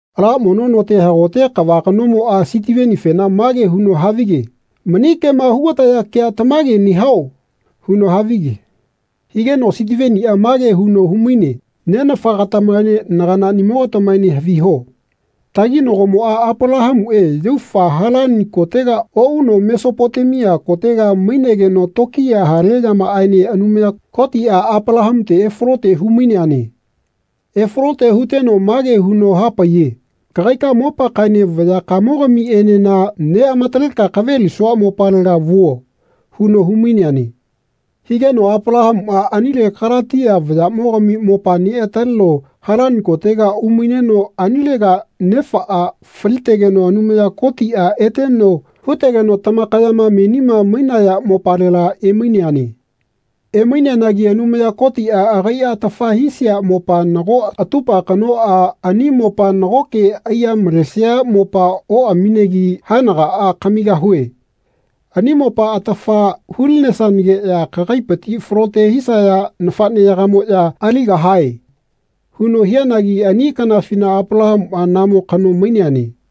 Ala mono note hagote kava kanomoꞌa Sitivenifena mage huno havige “Mani kema hugataya kea tamage nehao?” huno havige. Higeno Sitiveniꞌa mage huno humaine nenafagatamaene naganaꞌni-mogatamaene haviho. Taginagomoꞌa Apalahamuꞌe yaufa Halani kotega oꞌuno Mesopotemia kotega mainegeno tokiya hale yamaꞌaene Anumaya Kotiꞌa Apalahamute efalote humaineane. Efalote huteno mage huno hapaiye “Kagaika mopakaꞌaene vayakamogamiꞌenena neꞌamataleka kavelisua mopalega vuo.” huno humaineane. Higeno Apalahamuꞌa anile Kalatia vayaꞌmogami mopa neꞌataleno Halani kotega umaineno anilega nefaꞌa falitegeno Anumaya Kotiꞌa eteno hutegeno tamakayama menima mainaya mopalela emaineane. Emaineanagi Anumaya Kotiꞌa agaiꞌa atafa hisia mopa nago atupa kanoꞌa ani mopa nagoke aiya malesia mopa oꞌaminegi “Haenagaꞌa kamigahue. Ani mopa atafa hulinesanageꞌya kagaipiti falote hisaya nafaꞌneyagamoꞌya aligahae.” huno hianagi ani kanafina Apalahamuꞌa namo kano maineane.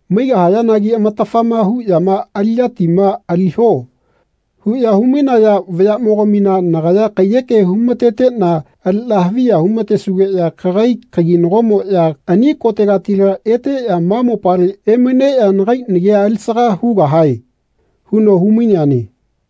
Maigahayanagi amatafama huꞌyama ‘Aliꞌyatima aliho.’ huꞌya humainaya vayaꞌmogamina nagaya kaiyeke humateteꞌna aliꞌna haviya humatesugeꞌya kagai kaginagomoꞌya ani kotegatila eteꞌya ma mopale emaineꞌya nagai nagia alisaga hugahae.” huno humaineane.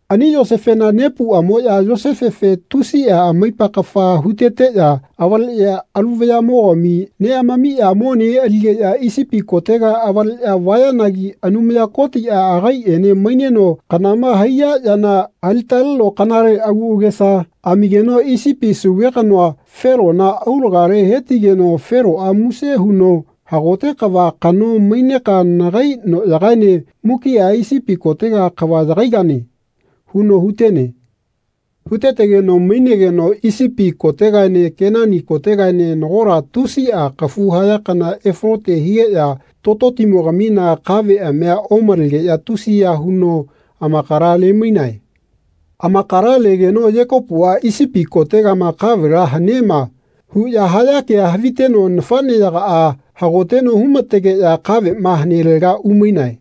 Ani Yosefena nepuꞌamoꞌya Yosefefe tusiꞌa amaipa kafa heteteꞌya avaleꞌya alu vayaꞌmogami neꞌamamiꞌya mone aligeꞌya Isipi kotega avaleꞌya vayanagi Anumaya Kotiꞌa agaiꞌene maineno kanama haiya yana alitaleno kanale agu agesa amigeno Isipi sauve kanoa, Felona, aulagale hetigeno Feloꞌa muse huno “Hagote kava kano maineka nagai noꞌyagaene mukiꞌa Isipi kotega kava yagaigane.” huno hutene. Hutetegeno mainegeno Isipi kotegaene Kenani kotegaene nagola tusiꞌa kafu haya kana efalote higeꞌya tototimogamina kaveꞌamia omalegeꞌya tusiya huno amakala lemainae. Amakala legeno Yekopuꞌa “Isipi koteꞌma kavela hanema.” huꞌya haya kea haviteno nafaꞌneyagaꞌa hagoteno humategeꞌya kaveꞌma hanelega umainae.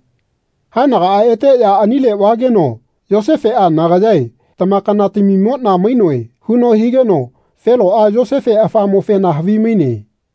Haenagaꞌa eteꞌya anile vageno Yosefeꞌa “Nagayae tamakanatamimoꞌna mainoe.” huno higeno Feloꞌa Yosefe afamofena havimaine.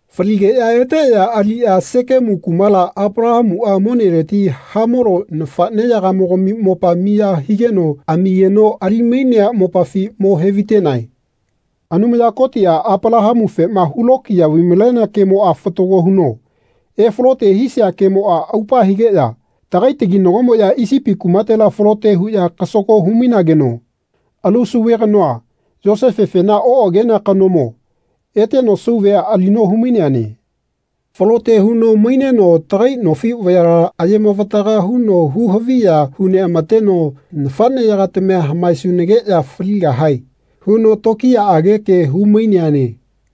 Faligeꞌya eteꞌya aliꞌya Sekemu kumala, Apalahamuꞌa moneleti Hamolo nafaꞌneyagamogami mopa miya higeno amigeno ali-mainea mopafi mo hevaitenae. Anumaya Kotiꞌa Apalahamufema hulokiya vai-malenea kemoꞌa fatago huno efalote hisia kanamoꞌa aupa higeꞌya tagai taginagomoꞌya Isipi kumatela falote huꞌya kasago humainageno alu sauve kanoa, Yosefefena oꞌagenea kanomo, eteno sauvea alino humaineane. Falote huno maineno tagai nofi vayala ayemavataga huno huhaviya huneꞌamateno “Nafaꞌneya-gatamia hamaesunageꞌya faligahae.” huno tokiyaꞌage ke humaineane.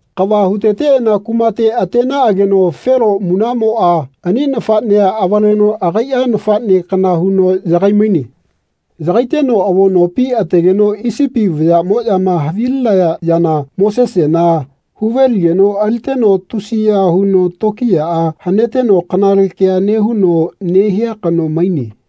Kava huteteꞌana kumate atenaꞌageno Felo munaꞌmoꞌa ani nafaꞌnea avaleno agaiꞌa nafaꞌne kana huno yagai-maine. Yagaiteno avo nopi ategeno Isipi vayaꞌmoꞌyama havilinaya yana Mosesena huve-ligeno aliteno tusiya huno tokiyaꞌa haneteno kanale kea nehuno nehia kano maine.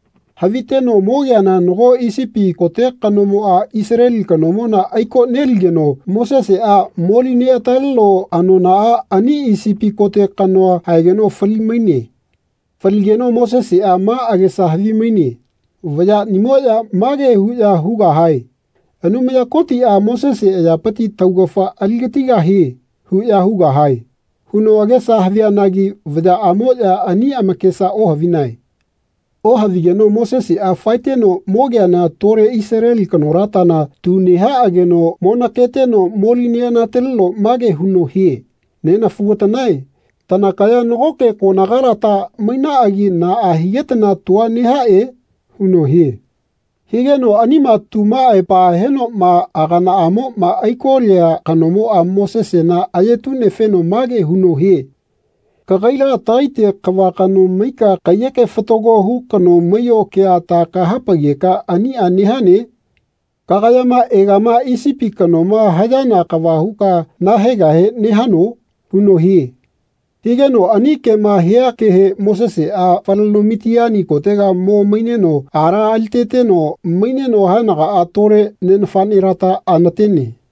Haviteno mogeana nago Isipi kote kanomoꞌa Isaleli kanomona aiko-neligeno Moseseꞌa moli-neꞌataleno anonaꞌa ani Isipi kote kanoa haegeno fali-maine. Faligeno Moseseꞌa ma agesa havimaine “Vayaꞌnimoꞌya mage huꞌya hugahae ‘Anumaya Kotiꞌa Mosese ayapiti taugafa aligatigahie.’ huꞌya hugahae.” huno agesa havianagi vayaꞌamoꞌya ani amakesa ohavinae. Ohavigeno Moseseꞌa faeteno mogeana tole Isaleli kanolatana tu nehaꞌageno monaketeno moli-neꞌanataleno mage huno hie “Nenafugatanae tanakaya nagoke konagalata mainaꞌagi naꞌa higetana tua nehaꞌe?” huno hie. Higeno anima tuma aepa henoꞌma aganaꞌamoma aiko-lia kanomoꞌa Mosesena ayetu-nefeno mage huno hie “Kagaila tagaite kava kano maika kaiyeke fatago hu kano maiyo kea ta kahapaigeka aniꞌa nehane? Kagayama egama Isipi kanoma hayana kava huka nahaegahe nehano?” huno hie. Higeno ani kema hia kehe Moseseꞌa faleno Mitiani kotega mo maineno ala aliteteno maineno haenagaꞌa tole ne nafaꞌnelata anatene.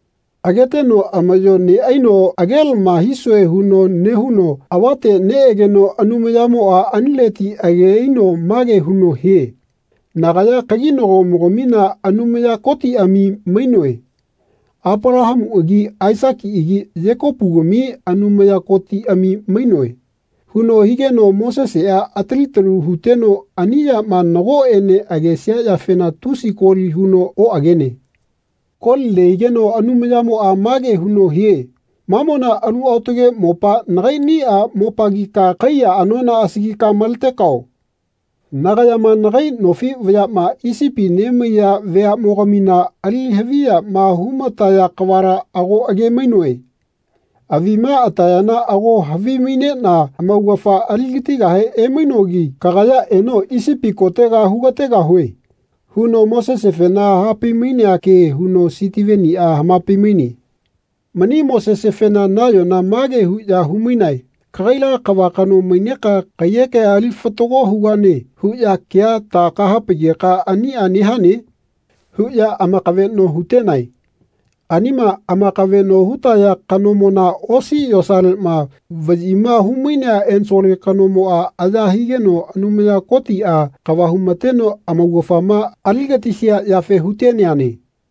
Ageteno amaꞌyo neꞌaino agelama hisue huno nehuno avate neꞌegeno Anumayamoꞌa anileti age aino mage huno hie “Nagaya kaginagomogamina Anumaya Kotiꞌami mainoe. Apalahamuꞌagi Aisakiꞌagi Yekopugami Anumaya Kotiꞌami mainoe.” huno higeno Moseseꞌa atali talu huteno ani yama nagoꞌene agesia yafena tusi koli huno oꞌagene. Koli nehigeno Anumayamoꞌa mage huno hie “Mamona alu aotage mopa nagaiꞌniꞌa mopagika kaiya anona asagika maletekao. Nagayama nagai nofi vayaꞌma Isipi nemaiya veaꞌnimoga-mina ali haviyama humataya kavala ago age-mainoe. Avima atayana ago havimaineꞌna amaugafa aligatigahe emainogi. Kagaya eno Isipi kotega hugategahue.” huno Mosesefena hapai-mainea ke huno Sitiveniꞌa hamapai-maine. Mani Mosesefena nayona mage huꞌya humainae “Kagaila kava kano maineka kaiyekea ali fatago hugane huꞌya kea ta kahapaigeka aniꞌa nehane?” huꞌya amakaveꞌno hutenae. Anima amakaveꞌno hutaya kanomona osi yosaleꞌma vaꞌyima humainea ensole kanomoꞌa aya higeno Anumaya Kotiꞌa kava humateno amaugafama aligatisia yafe huteneane.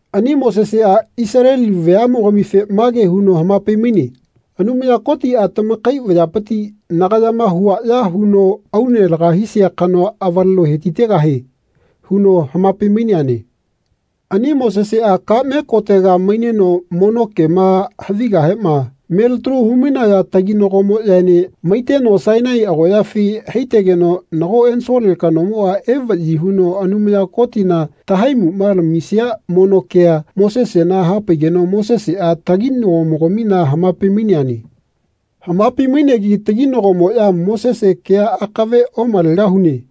Ani Moseseꞌa Isaleli veaꞌmogamife mage huno hamapai-maine “Anumaya Kotiꞌa tamakai vayapiti nagayama huaꞌya huno aune laga hisia kanoa avaleno hetitegahie.” huno hamapai-maineane. Ani Moseseꞌa kaꞌme kotega maineno mono kema havigahema melitalu humainaya taginagomoꞌyaene maiteno Sainai agoꞌyafi haitegeno nago ensole kanomoꞌa evaꞌyi huno Anumaya Kotina tahaimuꞌma lamisia mono kea Mosesena hapaigeno Moseseꞌa taginagomogamina hamapai-maineane. Hamapai-mainegi taginagomoꞌya “Mosese kea akave omalegahune.”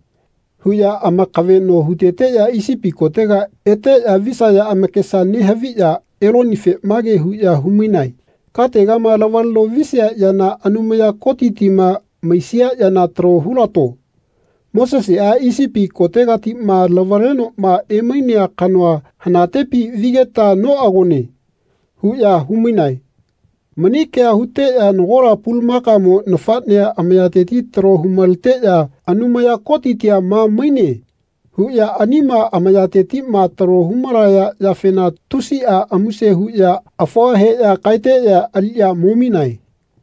huꞌya amakaveꞌno huteteꞌya Isipi kotega eteꞌya visaya amakesa nehaviꞌya Elonife mage huꞌya humainae “Kategama lavaleno visia yana Anumaya Kotitima maisia yana talo hulato. Moseseꞌa, Isipi kotegatiꞌma lavalenoꞌma emainea kanoa hanatepi vigeta noꞌagone.” huꞌya humainae. Mani kea huteꞌya nagola pulamakamo nafaꞌnea amayateti talo humaleteꞌya “Anumaya Kotitia ma maine.” huꞌya anima amayatetiꞌma talo humalaya yafena tusiꞌa muse huꞌya afua heꞌya kaeteꞌya aliꞌya mominae.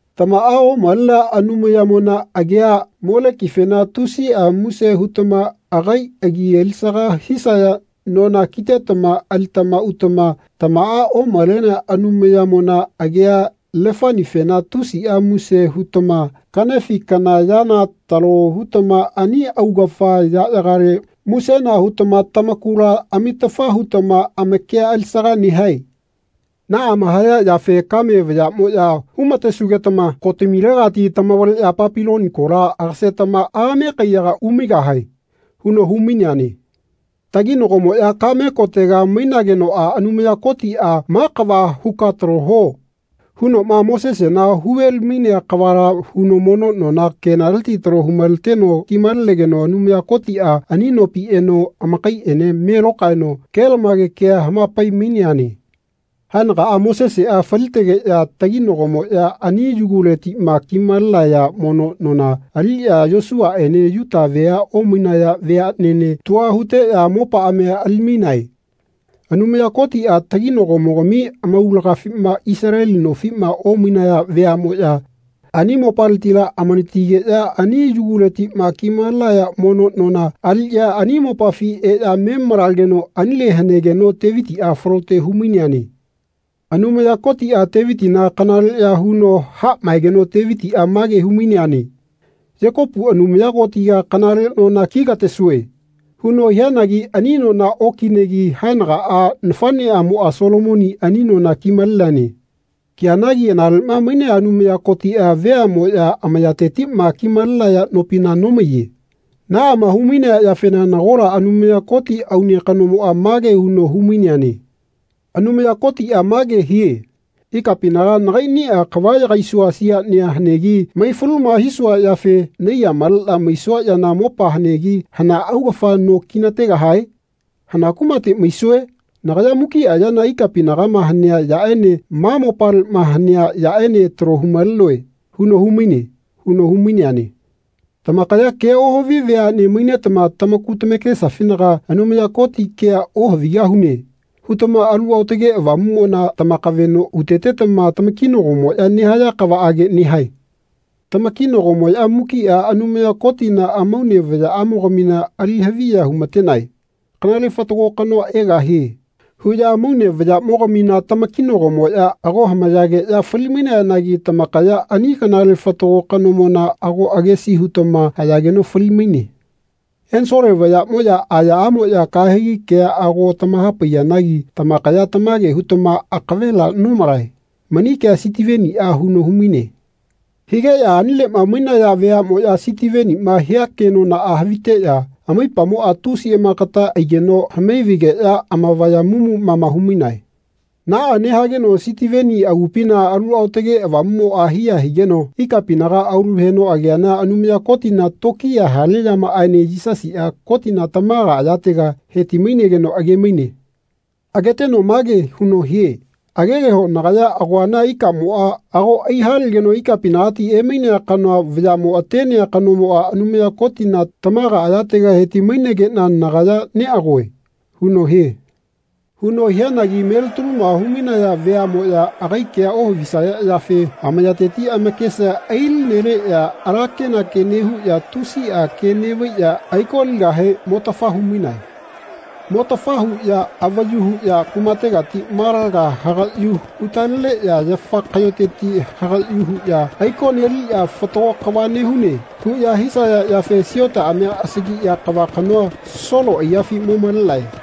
Tamaꞌa omalenea Anumayamona agiꞌa Molekifena tusiꞌa muse hutama agai agi alisaga hisaya nona kitetama alitama utama tamaꞌa omalenea Anumayamona agia Lefanifena tusiꞌa muse hutama kaꞌnefi kana yana talo hutama ani augafa yaꞌyagale musena hutama tamakula amitafa hutama amakia alisaga nehae. Naꞌama haya yafe kame vayaꞌmoꞌya humatesugetama kotamilegatila tamavaleꞌya Papiloni kola agasetama ame kaiyaga umaigahae.” huno humaineane. Taginagomoꞌya kaꞌme kotegama mainagenoꞌa Anumaya Kotiꞌa “Ma kava huka talo huo.” hunoꞌma Mosesena huveli-mainea kavala huno mono nona kenaleti talo humaleteno kimalenegeno Anumaya Kotiꞌa ani nopi eno amakaiꞌene me lokaeno kelamage kea hamapai-maineane. Haenagaꞌa Moseseꞌa falitegeꞌya taginagomoꞌya ani yuguletiꞌma kimalenaya mono nona aliꞌya Yosuaꞌene Yuta vea omainaya veaꞌnene tua huteꞌya mopaꞌamia ali-mainae. Anumaya Kotiꞌa taginagomogami amaulagafima Isaleli nofiꞌma omainaya veaꞌmoꞌya ani mopaletila amanatigeꞌya ani yuguletiꞌma kimalenaya mono nona aliꞌya ani mopafi eꞌya me malageno anile hanegeno Tevitiꞌa falote humaineane. Anumaya Kotiꞌa Tevitina kanaleꞌya huno haꞌmaegeno Tevitiꞌa mage humainene “Yekopu Anumaya Kotiga kanale nona kigatesue.” huno hianagi ani nona okinegi haenagaꞌa nafaꞌneꞌamoꞌa Solomoni ani nona kimaleneane. Kianagi analeꞌma mainea Anumaya Kotiꞌa veaꞌmoꞌya amayatetiꞌma kimalenaya nopina nomaiye. Naꞌama humainea yafena nagola Anumaya Koti aune kanomoꞌa mage huno humaineane “Anumaya Kotiꞌa mage hie ‘Ikapinaga nagaiꞌniꞌa kava yagaisua siaꞌnia hanegi maifaluma hisua yafe naiya maleꞌna maisua yana mopa hanegi hana augafa no kinategahae? Hana kumate maisue? Nagaya mukiꞌa yana ikapinagama hanea yaꞌene ma mopaleꞌma hanea yaꞌene talo humalenoe.’ huno humaine.” huno humaineane. Tamakaya kea ohavi veaꞌne mainetama tamaku tamakesafinaga “Anumaya Koti kea ohavigahune.” hutama Alu Aotage Avamuꞌmona tamakaveꞌno hutetetama tamakinagomoꞌya nehaya kavaꞌage nehae. Tamakinagomoꞌya mukiꞌa Anumaya Kotina amaune vayaꞌamogamina ali haviya humatenae. “Kanale Fatago Kanoa egahie.” huꞌya amaune vayaꞌmogamina tamakinagomoꞌya ago hamayageꞌya falimainayanagi tamakaya ani Kanale Fatago Kanomona ago agesi hutama hayageno fali-maine. Ensole vayaꞌmoꞌya ayaꞌamoꞌya kahegi kea ago tamahapaiyanagi tamakaya tamage hutama akavela nomalae. Mani kea Sitiveniꞌa huno humaine. Higeꞌya anileꞌma mainaya veaꞌmoꞌya Sitiveniꞌma hia kemona haviteꞌya amaipamoꞌa tusi amakata aiteno hamai-vaigeꞌya amavaya mumu mama humainae. Naꞌa nehageno Sitiveni agupina Alu Aotage Avamuꞌmoꞌa hiya higeno ikapinaga aulu heno ageana Anumaya Kotina tokiya hale yamaꞌaene Yisasiꞌa Kotina tamaga ayatega heti-mainegeno age-maine. Ageteno mage huno hie “Agegeho nagaya agoana ikamoꞌa ago aihalegeno ikapinagati emainea kanoa vayaꞌmo atenea kanomoꞌa Anumaya Kotina tamaga ayatega heti-mainegeꞌna nagaya neꞌagoe.” huno hie. Huno hianagi melitaluma humainaya veaꞌmoꞌya agai kea ohavisaya yafe amayateti amakesa ailineleꞌya ala kenake nehuꞌya tusiꞌa ke neꞌvaiꞌya aiko-ligahe motafa humainae. Motafa huꞌya avayu huꞌya kumategati malaga hagaꞌyu hutaleneꞌya yafa kaꞌyoteti hagaꞌyu huꞌya aiko-neliꞌya “Fatago kava nehune” huꞌya hisaya yafe siotaꞌamia asagiꞌya kava kanoa, Solo aiyafi mo-malenae.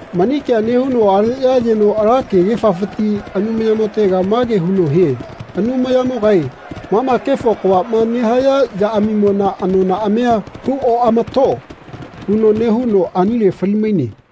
Mani kea nehuno aleꞌya ayeno ala kegefafiti Anumayamotega mage huno hie “Anumayamogae mama kefo kavaꞌma nehaya yaꞌamimona anonaꞌamia hu-oꞌama-to.” huno nehuno anile fali-maine.